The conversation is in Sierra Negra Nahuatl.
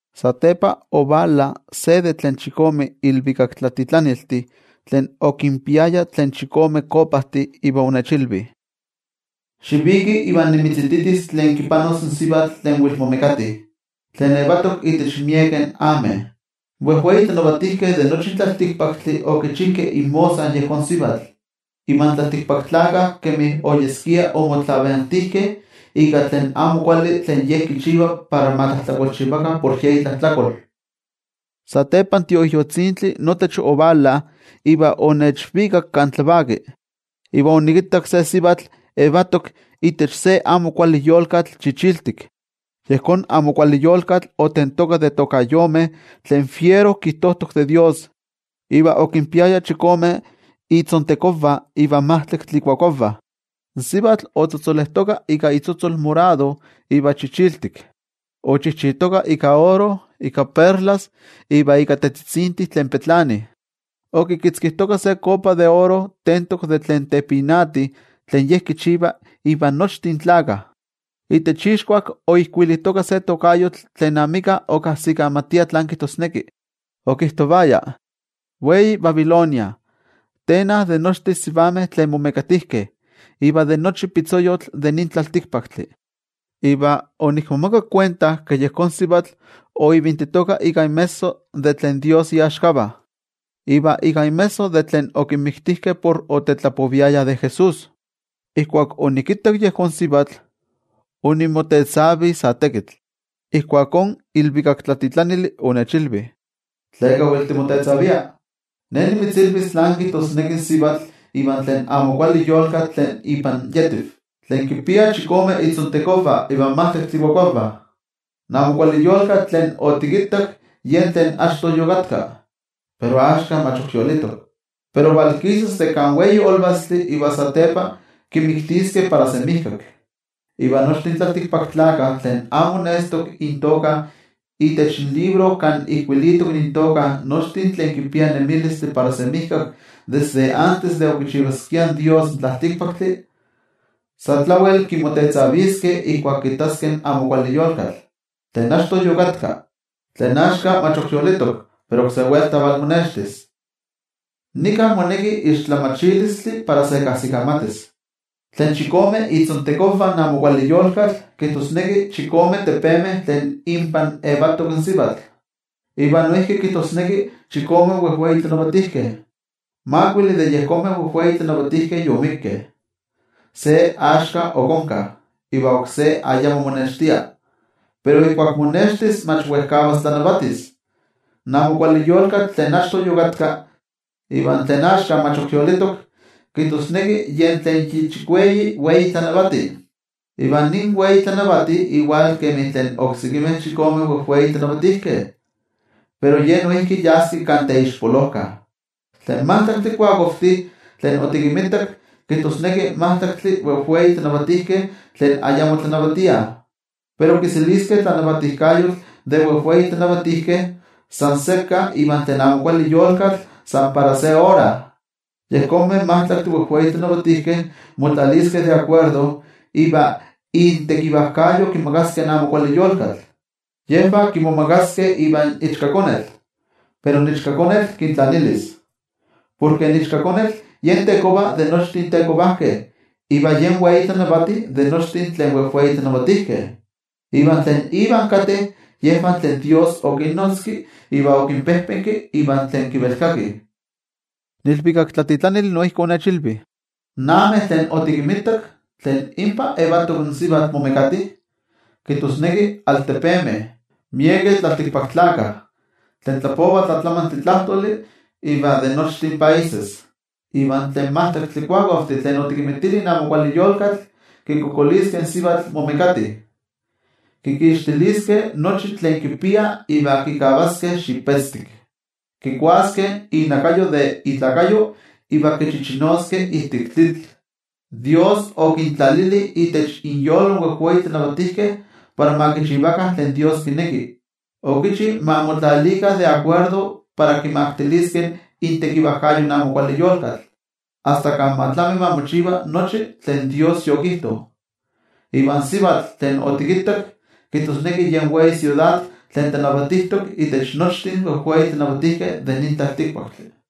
Satepa ovala se de tlen chikome ilvikaktlatitlaniltih tlen okinpiaya tlen chikome kopajtih, iva onechilvi: —Xiviki iva nimitzititis tlen kipanos in sivatl tlen wel momekati, tlen yetok itech miekeh ameh. In wejwei tlanavatijkeh de nochi in tlaltikpaktli okichijkeh inmosa yejón sivatl. Iva in tlaltikpaktlakah kemi oyeskia omotlavantijkeh ika tlen amo kuali tlen ye kichiva para ma tlajtlakolchivakah por ye itlajtlakol. Satepa in Tioijyotzintli notech ovala iva onechvikak kan tlavaki. Iva onikittak se sivatl yetok itech se amo kuali yolkatl chichiltik. Yejón amo kuali yolkatl otentoka de tokayomeh tlen fiero kijtojtok de toYejwatzi, iva okinpiaya chikome itzontekonvah iva majtlaktli ikuakuavah. In sivatl otzotzolejtoka ika itzotzol morado iva chichiltik. Ochijchitoka ika oro, ika perlas iva ika tetzitzintih tlen petlanih. Okitzkijtoka se kopa de oro tentok de tlen tepinati tlen ye kichiva invan nochtin tlakah. Itech ixkuak oijkuilitoka se tokayotl tlen amika okajsikamatia tlán kijtosneki, okijtovaya: “Wei Babilonia, teena de nochtin sivameh tlen momekatijkeh iva de nochi pitzoyotl de nin tlaltikpaktli.” Iva onikmomakak kuenta ke yejón sivatl oivintitoka ika inmesso de tlen toYejwatzi iaxkavah iva ika inmesso de tlen okinmiktijkeh por otetlapoviayah de Jesús. Ijkuak onikittak yejón sivatl, onikmotetzavi sa tekitl. Ijkuakó in ilvikaktlatitlanili onechilvi: —¿Tleka wel tikmotetzavia? Ne nimitzilvis tlán kijtosneki in sivatl iva tlen amo kuali yolkatl tlen ipan yetiv, tlen kinpia chikome itzontekonvah iva majtlaktli ikuakuavah. In amo kuali yolkatl tlen otikittak yen tlen achto yokatka, pero axka mach ok yolitok. Pero valkisas de kan wei olvastli iva satepa kimiktiskeh para semijkak. Iva nochtin tlaltikpaktlakah, tlen amo nestok intoka itech libro kan ijkuilitok intoka nochtin tlen kipiah nemilistli para semijkak desde antes de okichivaskia in tlaltikpaktli in Dios, sa tlawel kimotetzaviskeh ijkuak kittaskeh in amo kuali yolkatl, tlen achto yokatka, tlen axka mach yolitok, pero oksé welta valmonextis. ’Nika moneki tlamatilistli para se kajsikamatis: Tlen chikome itzontekonvah in amo kuali yolkatl kijtosneki chikome tepemeh tlen inpan yetok in sivatl, iva noijki kijtosneki chikome wejwei tlanavatijkeh. Makuili de yejonmeh wejwei tlanavatijkeh yomikkeh, se axka ok onka, iva oksé ayamo monextia. Pero ijkuak monextis mach wejkavas tlanavatis. In amo kuali yolkatl tlen achto yokatka, iva tlen axka mach ok yolitok, kijtosneki yen tlen yi chikueyi wei tlanavati. Iva nin wei tlanavati iwal kemi tlen oksekimeh chikome wejwei tlanavatijkeh, pero ye noijki yaski kan teixpolojka. ’Tlen majtlaktli kuakuavtih tlen otikinmitak kijtosneki majtlaktli wejwei tlanavatijkeh tlen ayamo tlanavatiah. Pero kiseliskeh tlanavatijkayotl de wejwei tlanavatijkeh san sekka ivan tlen amo kuali yolkatl san para se ora. Yejonmeh majtlaktih wejwei tlanavatijkeh motlatlalviskeh, iva intekivajkayo kimakaskeh in amo kuali yolkatl. Yejvah kimomagaskeh ivan Ichkakonetl, pero in Ichkakonetl kintlanilis. Porke in Ichkakonetl yen Tekova de nochtin tetekovajkeh iva yen Wei Tlanavati de nochtin tlen wejwei tlatlanavatijkeh. Iva tlen Ivan kateh yejvah tlen toYejwatzi okinnotzki iva okinpejpenki, iva tlen kivelkakih. In ilvikaktlatitlanili noijki onechilvi: —In ameh tlen otikinmitak, tlen inpa yetok in sivatl momekati, kijtosneki altepemeh, miekeh tlaltikpaktlakah, tlen tlapovah tlatlamantli tlajtoli, iva de nochtin países. Iva tlen majtlaktli kuakuavtih tlen otikinmitili in amo kuali yolkatl, kikualankaitaskeh in sivatl momekati. Kikixtiliskeh nochi tlen kipia iva kikavaskeh xipetztik. Kikuaskeh inakayo de ikuerpo iva tlen ok mokavas kichichinoskeh ijtik tlitl. Dios okintlalili itech inyolo in wejwei tlanavatijkeh para ma kichivakah tlen Dios kineki. Okichi ma motlatlalvikah para kimaktiliskeh intekivajkayo in amo kuali yolkatl, asta kan ma tlami ma mochiva nochi tlen Dios yokijto. Iva in sivatl tlen otikittak, kijtosneki yen wei siudad tlen tlanavatijtok itech nochtin wejwei tlanavatijkeh de nin tlaltikpaktli.